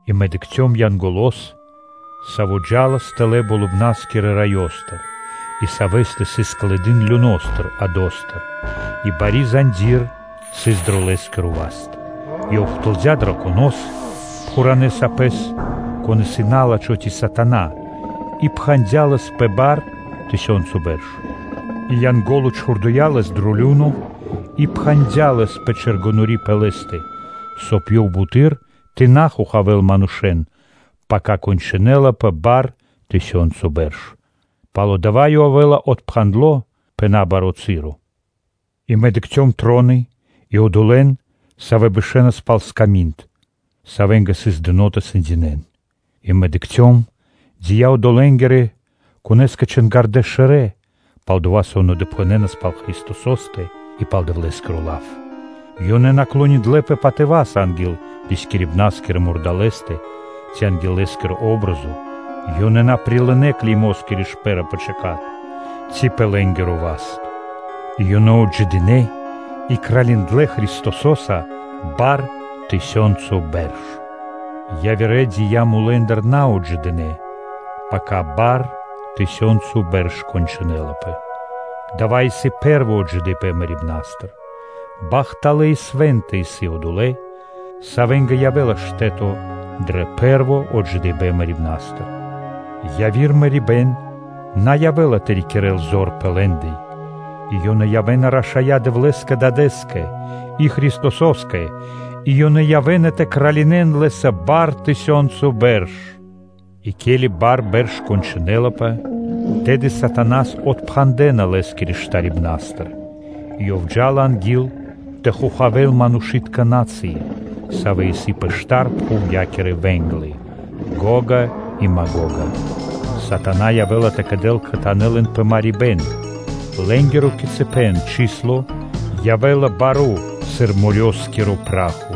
И мэ дыкхцём Янголо́с, Саво́ джа́лас тэлэ́ Болыбна́стыр Раёстыр и Савэ́стэ сыс клыды́н люностыр (адостыр), и сыс бари заньди́р (цэпо) дро Лэ́скиро васт. Ёв ухтылдя драконос, пхуранэ́ сапэс, кон исын на́лачхо ци сатана и пхандя лэс пэ бар (тысёнцо) бэрш; и Янго́ло чхурдыя́ лэс дро лю́но и пхандя лэс пэ чэргэнори́ (печать) пэ лэ́стэ, соб (кай) ёв буты́р тэ на хохавэ́л манушэ́н пака кончынэлапэ тысёнцо (бар) бэрш. Пало́ дава́ ёв явэ́ла отпхандло пэ набаро́ часо. И мэ дыкхцём троны и одолэ́н, савэ́ бэшэнас пал сками́нд, савэ́нгэ сыс дыно́ тэ сэндякирэн. И мэ дыкхцём дия́ одолэнгирэ, конэ́скэ чингирдэ шэрэ́, палдова́ со ёнэ допхэнэнас пал Христосо́стэ и пал Дэвлэ́скиро лав. Ёнэ на клониндлэпэ патыва́са анги́л рискирибна́скирэ мурдалэ́стэ ци анги́л лэ́скири патри́н (о́бразо), ёнэ на прилынэ́ клеймоскири шпэ́ра пэ чэка́т ци пэ лэ́нгиро васт. И ёнэ отджидынэ и кралиндлэ Христосо́са бар бэрш. Яви́р дия́ мулэ́ндыр на отджидынэ, пака бар бэрш кончынэлапэ. Дава́ исын пэ́рво отджидыипэн мэрибна́стыр. Бахталэ́ и свэ́нта исын одолэ́, савэ́нгэ явэ́ла штэ́то дро пэ́рво отджидыипэн мэрибна́стыр. Яви́р мэрибэ́н на явэ́ла тэ рикирэ́л зор пэ лэ́ндэ, а ёнэ явэ́на рашая́ Дэвлэ́скэ и Христосо́скэ, и ёнэ явэ́на тэ кралинэн Лэ́са бар бэрш. И ке́ли бар (тысёнцо) бэрш кончынэлапэ, тэды сатанас (налачхэ́с) отпхандэна лэ́скирэ штарибнастыр, и ёв джа́ла анги́л тэ хохавэ́л манушы́тка на́цыи (народы), савэ́ исын пэ штар пхувья́кирэ вэ́нглы, Гога и Магога. На́лачхо явэ́ла тэ кэдэл кхэтанэ́ лэн пэ марибэ́н, лэ́нгиро кицыпэн (количэство) явэ́ла баро́-сыр морёскиро (дэрьявэ́скиро) пра́хо.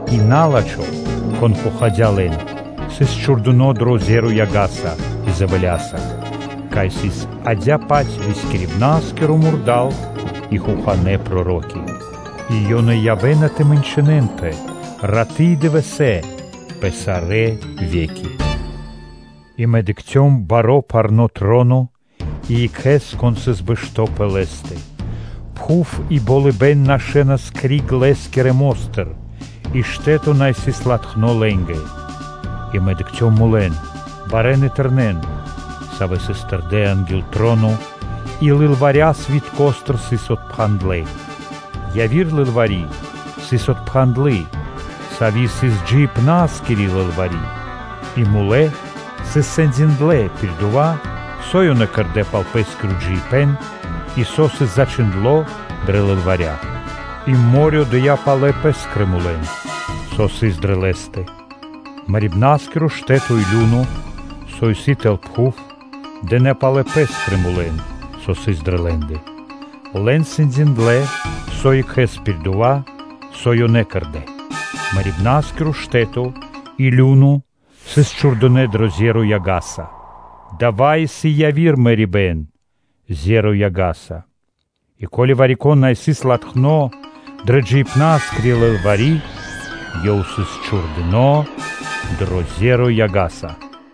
И на́лачхо, кон хохадя лэн, сыс чхурдыно́ дро зеро (озеро) яга́са и дзэвэля́са (сераса), кай сыс адя́кэ-паць рискирибна́скиро мурда́л и хоханэ́ проро́ки. И ёнэ явэ́на тэ мэнчынэнпэ раты́ и дывэсэ́ пэ сарэ́ ве́ки. И мэ дыкхцём баро́ парно́ троно и Екхэ́с, Кон сыс бэшто́ пэ лэ́стэ. Пхув и болыбэ́н нашэнас криг Лэ́скирэ мо́стыр и штэ́то на сыс латхно лэ́нгэ. И мэ дыкхцём мулэн, барэн и тэрнэн, савэ́ сыс тэрдэ́ анги́л троно и лылваря свиткостыр сыс отпхандлэ. Яви́р лылвари́ сыс отпхандлы, сави́ сыс джиибна́скири лылвари́, и мулэ́ сыс сэндиндлэ пир дова́, со ёнэ кэрдэ́ пал пэ́скиро джиибэ́н, и со сыс зачхиндло́ дрэ лылваря. И мо́рё (дэрья́в) отдыя́ пэ́скирэ мулэн, со сыс дрэ лэ́стэ. Мэрибнаскиро штэ́то и лю́но (адо), со исын тэл пхув, дынэ́ палэ пэ́скрэ мулэн, савэ́ сыс дрэ лэ́ндэ. Лэн сэндиндлэ со екхэ́с пир дова́, со ёнэ кэрдэ́. Мэрибнаскиро штэ́то и лю́но (адо) сыс чхурдынэ́ дро зеро яга́са. Дава́ исын яви́р мэрибэ́н-зеро яга́са. И ко́ли вари-кон на сыс латхно дрэ джиибнаскри лылвари́, ёв сыс чхурдыно́ дро зеро (озеро) яга́са.